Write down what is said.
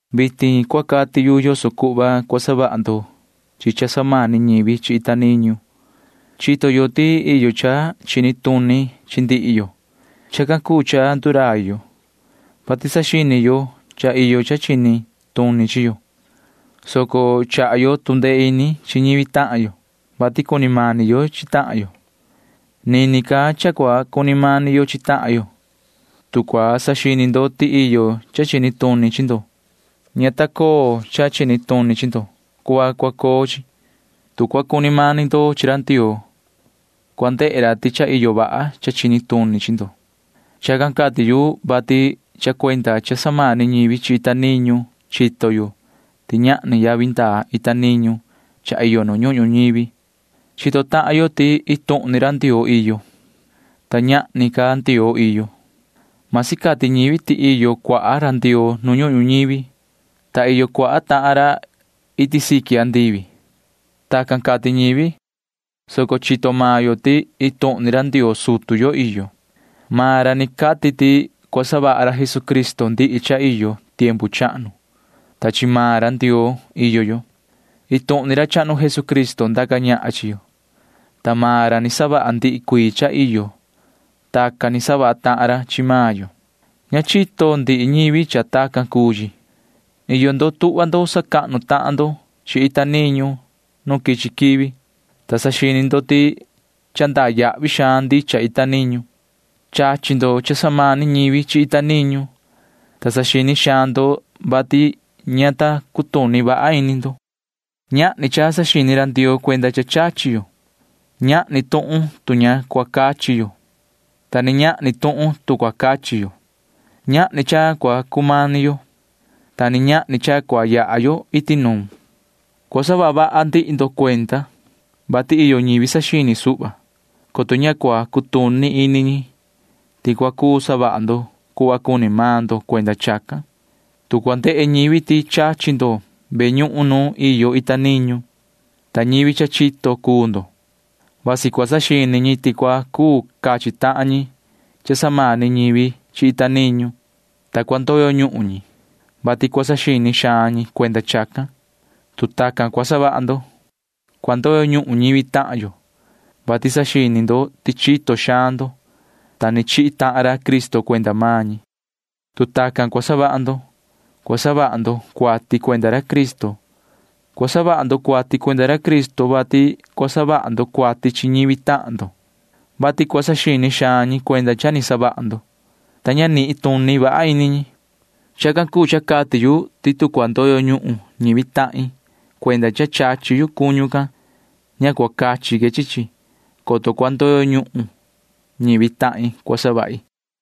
Vitin cua cati yu yoso cuhva cua savaha ndo chi cha samani ñivi chi ita niñu. Chito yo ti iyo cha chini tuni chi ndihi yo. Chacan cuu cha ndurai yo, vati saxini yo cha iyo cha chini tuni chi yo, soco chaha yo tu ndee ini chi ñivi tahan yo, vati cuni mani yo chi tahan yo. Nini ca cha cua cuni mani yo chi tahan yo. Tu cua saxini ndo ti iyo cha chini tuni chi ndo, ña ta coo cha chini tuni chi ndo cuhva cua coo chi. Tu cua cuni mani ndo chi ra Ndioo, cua ndehe ra ti cha iyo vaha cha chini tuni chi ndo. Chacan cati yu, vati cha cuenda cha samani ñivi chi ita niñu chito yo ti ñahni yavi ndaa ita niñu cha iyo nu ñuhun ñuñivi. Chito tahan yo ti iin tuhun ni ra Ndioo iyo, ta ñahni ca ndioo iyo. Masi cati ñivi ti iyo cuaha ra ndioo nu ñuhun ñuñivi, ta iyo cuaha tahan ra iti siqui andivi. Tacan cati ñivi, soco chito maan yo ti iin tuhun ni ra Ndioo sutu yo iyo. Maan ra ni cati ti cua savaha ra Jesucristo ndihi cha iyo tiempu chahnu, ta chi maan ra Ndioo iyo yo. Iin tuhun ni ra chahnu Jesucristo ndaca ñahan chi yo, ta maan ra ni savaha ndihi cuii cha iyo. Tacan ni savaha tahan ra chi maan yo. Ña chito ndihi ñivi cha tacan cuu chi. Iyo ndo tuhva ndo sacahnu tahan ndo chi ita niñu nu quichi quivi, ta saxini ndo ti cha ndaa yahvi xaan ndicha ita niñu. Chachi ndo cha samani ñivi chi ita niñu, ta saxini xaan ndo, vati ña ta cutuni vaha ini ndo. Ñahni cha saxini ra Ndioo cuenda cha chachi yo. Ñahni tuhun tu ña cua cachi yo, ta ni ñahni tuhun tu cua cachi yo. Ñahni cha cua cumani yo, ta ni ñahni cha cua yaha yo iti nuun. Cua saha vaha ndihi ndo cuenda, vati iyo ñivi saxini suhva, coto ña cua cutuni ini ñi ti cua cuu savaha ndo cuhva cuni maan ndo cuenda chacan. Tu cua ndehe ñivi ti chachi ndo ve ñuhun nu iyo ita niñu, ta ñivi cha chito cuu ndo, vasi cua saxini ñi ti cua cuu cachi tahan ñi cha samani ñivi chi ita niñu, ta cua ndoyo ñuhun ñi, [vati cua saxini xaan ñi cuenda chacan]. Tu tacan cua savaha ndo, cua ndoyo ñuhun ñivi tahan yo, vati saxini ndo ti chito xaan ndo, ta ni chihi tahan ra Cristo cuenda maan ñi. Tu tacan cua savaha ndo, cua savaha ndo cuati cuenda ra Cristo. Cua savaha ndo cuati cuenda ra Cristo, vati cua savaha ndo cuati chi ñivi tahan ndo, vati cua saxini xaan ñi cuenda cha ni savaha ndo, ta ña nituni vaha ini ñi. Chacan cuu cha cati yu ti tu cua ndoyo ñuhun ñivi tahin cuenda cha chachi yu cuñu can, ña cua cachi que chi chi, coto cua ndoyo ñuhun ñivi tahin cua savahi.